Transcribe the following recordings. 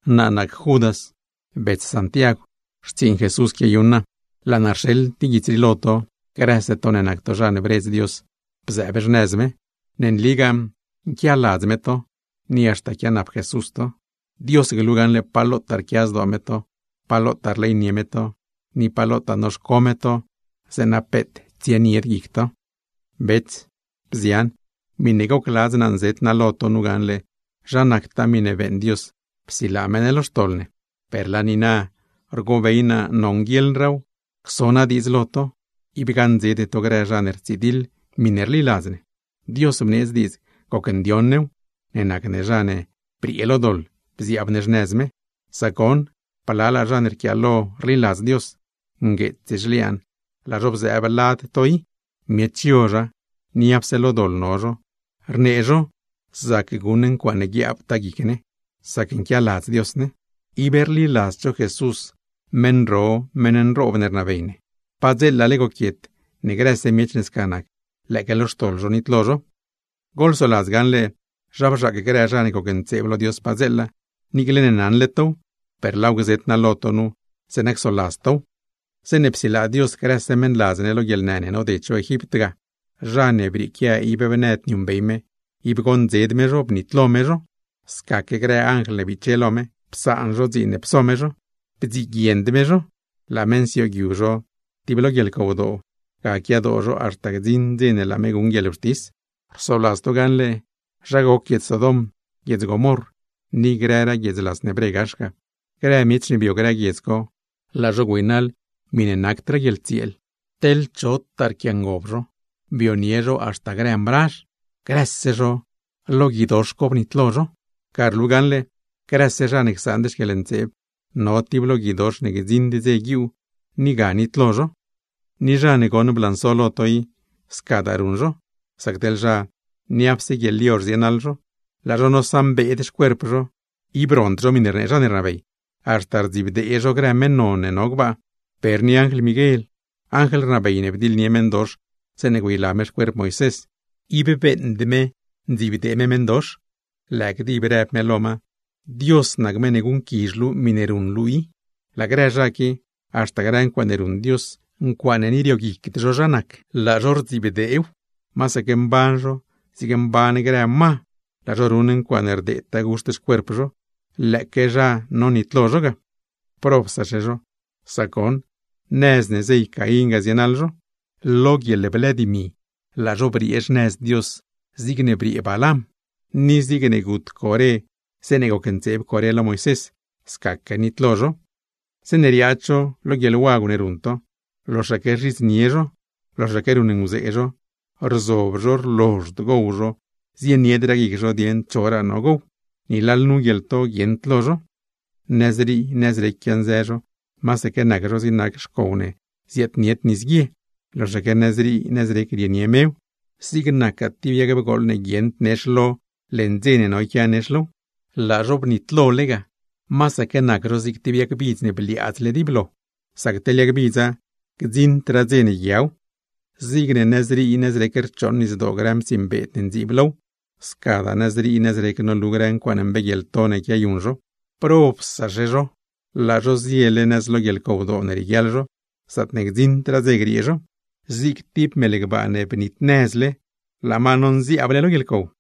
Naa nac Judas, bets Santiagw; xtsiiṉ Jesús quiayuṉ naa. Laa naa rxeḻ guits rii lo to, grëse to ne nac to zha ne bredz Dios bzëëb xnëz me. Ne nligaa nquialadz me to, ni haxta quianap Jesús to. Dios glu gaṉle pa lotaa rquia zdoo me to, pa lotaa rleynie me to, ni pa lotaa noxco me to zeeṉa peet tsienied guic to. Bets, bzian, miṉe gocladz naa nzet naa nu gaṉle zha nactaa miṉe beeṉ Dios psilaa me ne lo xtoḻ ne; per na rgobey naa nonguieḻraaw cso naa diidz lo to, ib gaṉdzede to grë zha ne rtsidiḻ miṉe rliladz ne. Dios bneedz diidz gocndioṉ new, ne nac ne zha ne briee lo doḻ bziaab ne xnëz me. Sac goṉ, blalaa zha ne rquiaalo rliladz Dios, ngueets zhliaan laa zho bzëëb lad to i. Miech yozha, niapse lo doḻ no zho, rnee zho zac guṉ ne ncuaaṉe guiaabtaa guic ne, sac nquialadz Dios ne; ib rliladzd zho Jesús, Meṉ ro, Meṉ nroob ne rnabey ne. Padzeelale goquiet, ne grëse miech ne sca nac, lëëque lo xtoḻ zho nitlo zho. Goḻsoladz gaṉle zha bzhaac grë zha ne gocntseeb lo Dios padzeela. Niicle ne naṉle tow, per laaw gzet naa lo to nu, zeeṉa csoladz tow: Zeeṉe psilaa Dios grëse meṉladz ne lo guieḻnë ne noded zho Egipt ga, zha ne brieequia ib bnëd niuṉbey me, ib goṉdzed me zho, bnitlo me zho. Scaque grë anjl ne biche lo me, psaan zho dziin ne pso me zho; bdziguiend me zho, laa me nsioogyu zho tib lo guieḻcowdoo, ga quiadoo zho haxta gdziṉ dze ne laa me guṉ guieḻwxtis. Rsoladz to gaṉle zha goc guiedz Sodom, guiedz Gomorr, ni grëraa guiedz las ne bre gax ga. Grë miech ne bio grë guiedz co, laa zho güeynaḻ miṉe nacdraa guieḻtsieel, teḻ chotaa pquiangob zho, bionie zho haxta grë mrazh; grëse zho, lo gui ga bnitlo zho. Ga rlu gaṉle, grëse zha ne csaand xquieḻntseeb, no tib lo guidox ne gdziṉd dze guiuu, ni ga nitlo zho. Ni zha ne goṉ blanso lo to i, scadaa ruṉ zho; sac teḻ zha, niapse guieḻyozh zienaḻ zho, laa zho nosaṉbeed xcuerp zho, ib rond zho miṉe rnee zha ne rnabey, haxta rdzibdee zho grë meṉ non ne no gbaa. Per ni anjl Miguel, anjl rnabey ne bdiḻnie meṉdox zeeṉe güeyla me xcuerp Moisés, ib beeṉd me ndziibdee me meṉdox; lëë gdib rëb me: “¡Dios nac meṉ ne guṉquizh luu miṉe ruṉ luu i!” Laa grë zha qui, haxta grë ncuaaṉe ruṉ Dios, ncuaaṉe ni rioguicd zho zha nac, laa zho rdzibdeew; masaque mban zho zigne mban grë ma, laa zho ruṉ ncuaaṉe rdeedtaa guxt xcuerp zho; lëëque zha nonitlo zho ga. ¡Probsaxe zho! Sac goṉ, nëz ne zey Caín ga zienaḻ zho. Lo guieḻblë dimi, laa zho briee xnëz Dios zigne briee Balam; ni zigne gut Coré zeeṉe gocntseeb me lo Moisés, scaque nitlo zho. Zeeṉe riaad zho lo guieḻwagw ne ruṉ to, loxaque rzhidznie zho, loxaque ruṉnguzee zho, rzob zho rlozhd gowcho zho, zieniedraa guic zho dieṉ choraa no gow; ni lalnu guieḻto guieṉd lo zho. Nëzrii nëzrec quianzë zho, masaque nac zho zig nac xcow ne ziaadnied nisguie, loxaque nëzrii nëzrec rienie mew; zig nac tib yag bgooḻ ne guieṉd nex lo, leṉ dze ne no yquia nex low. Laa zho bnitlole ga, masaque nac zho zig tib yag bidz ne bliaadzle dib lo; sac teḻ yag bidza, gdziṉdraa dze ne yguiaw. Zigne nëzrii nëzrec rchooṉ nisdoo grë mtsiiṉ beed ne ndziib low, scadaa nëzrii nëzrec nolu grë ncuaaṉe mbeeguieḻto ne quiayuṉ zho. Laa zho ziele nëz lo guieḻcowdoo ne rieguiaḻ zho, zaatne gdziṉdraa dze griee zho; zig tib mel gbaa ne bnitnëzle, laa ma nonziaabse lo guieḻcow.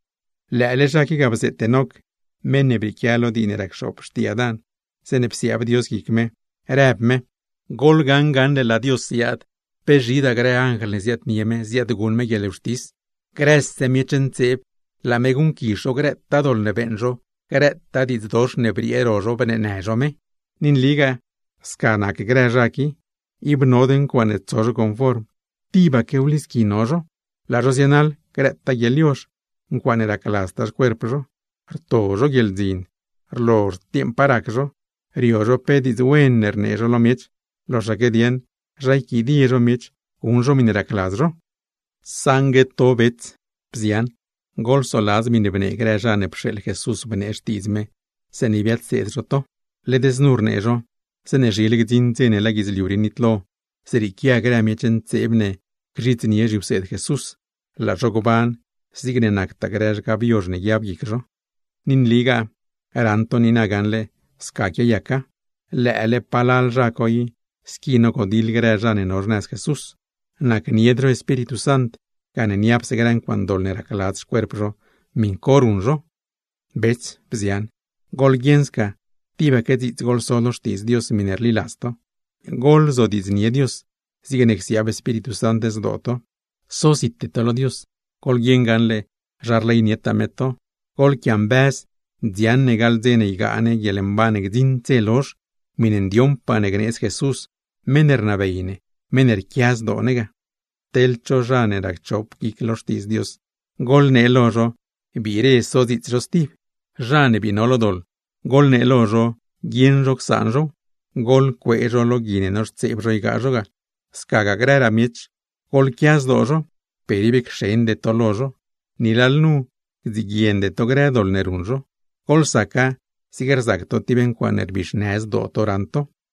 Lëële zha qui ga bzeet Enoc (meṉ ne brieequia lo dii ne rac xoop xtii Adán), zeeṉe psiaab Dios guic me, rëb me: “Goḻwi gaṉle laa Dios ziaad, pe zhidaa grë anjl ne ziaadnie me, ziaadguṉ me guieḻwxtis. Grëse miech ntseeb, laa me guṉquizh zho grëtaa doḻ ne beeṉ zho, grëtaa diidz dox ne briee ro zho bneenë zho me.” Ni nligaa sca nac grë zha qui, ib nod ncuaaṉe tso zho conform, tibaque wlisqui no zho; laa zho zienaḻ grëtaa guieḻyozh, ncuaaṉe racladztaa xcuerp zho. Rto zho guieḻdzin, rlozhd dieeṉ pa rac zho, rio zho pe diidz wen ne rnee zho lo miech, loxaque ne dieṉ zha yquidie zho miech, guṉ zho miṉe racladz zho. Saṉgue to bets, bzian, goḻsoladz miṉe bnee grë zha ne pxeeḻ Jesús bnee Xtiidz me, zeeṉe biadseed zho to; led znu rnee zho: “Zeeṉe zhile gdziṉ dze ne laa guidzliu rii nitlo, zrieequia grë miech ntseeb ne gzhidznie zhiwseed Jesús, laa zho gban zigne nactaa grë zhgab yozh ne guiab guic zho.” Ni nligaa raṉ to niina gaṉle sca quiayaca, lëë grë zha co i squi nogodiḻ grë zha ne no xnëz Jesús. Nacnied zho Espíritu Sant, gane niapse grë ncuaaṉe doḻ ne racladz xcuerp zho, miṉ co ruṉ zho. Bets, bzian, goḻguieṉ sca tibaque dziits goḻso lo Xtiidz Dios miṉe rliladz to. Goḻzodiidznie Dios, zigne csiaab Espíritu Sant zdoo to. Sozite to lo Dios, goḻguieṉ gaṉle zha rleynietaa me to; goḻquiambëz dziaṉ ne gaḻ dze ne ygaa ne guieḻmban ne gdziṉd dze lozh, miṉe ndioṉpaa ne gneedz Jesús meṉ ne rnabey ne, porne rquia zdoo me ne. Teḻ cho zha ne racchop guic lo Xtiidz Dios, goḻnee lo zho biire sodziits zho stib. Zha ne bii no lo doḻ, goḻnee lo zho guieṉ zho csaan zhow; goḻcuee zho lo gui ne noxtseeb zho ygaa zho ga; scagaa grëraa miech, goḻquia zdoo zho, per ib cxende to lo zho. Ni lalnu gdziguiende to grë doḻ ne ruṉ zho, goḻsaca zig rzac to tib ncuaaṉe rbixnë zdoo to raṉ to.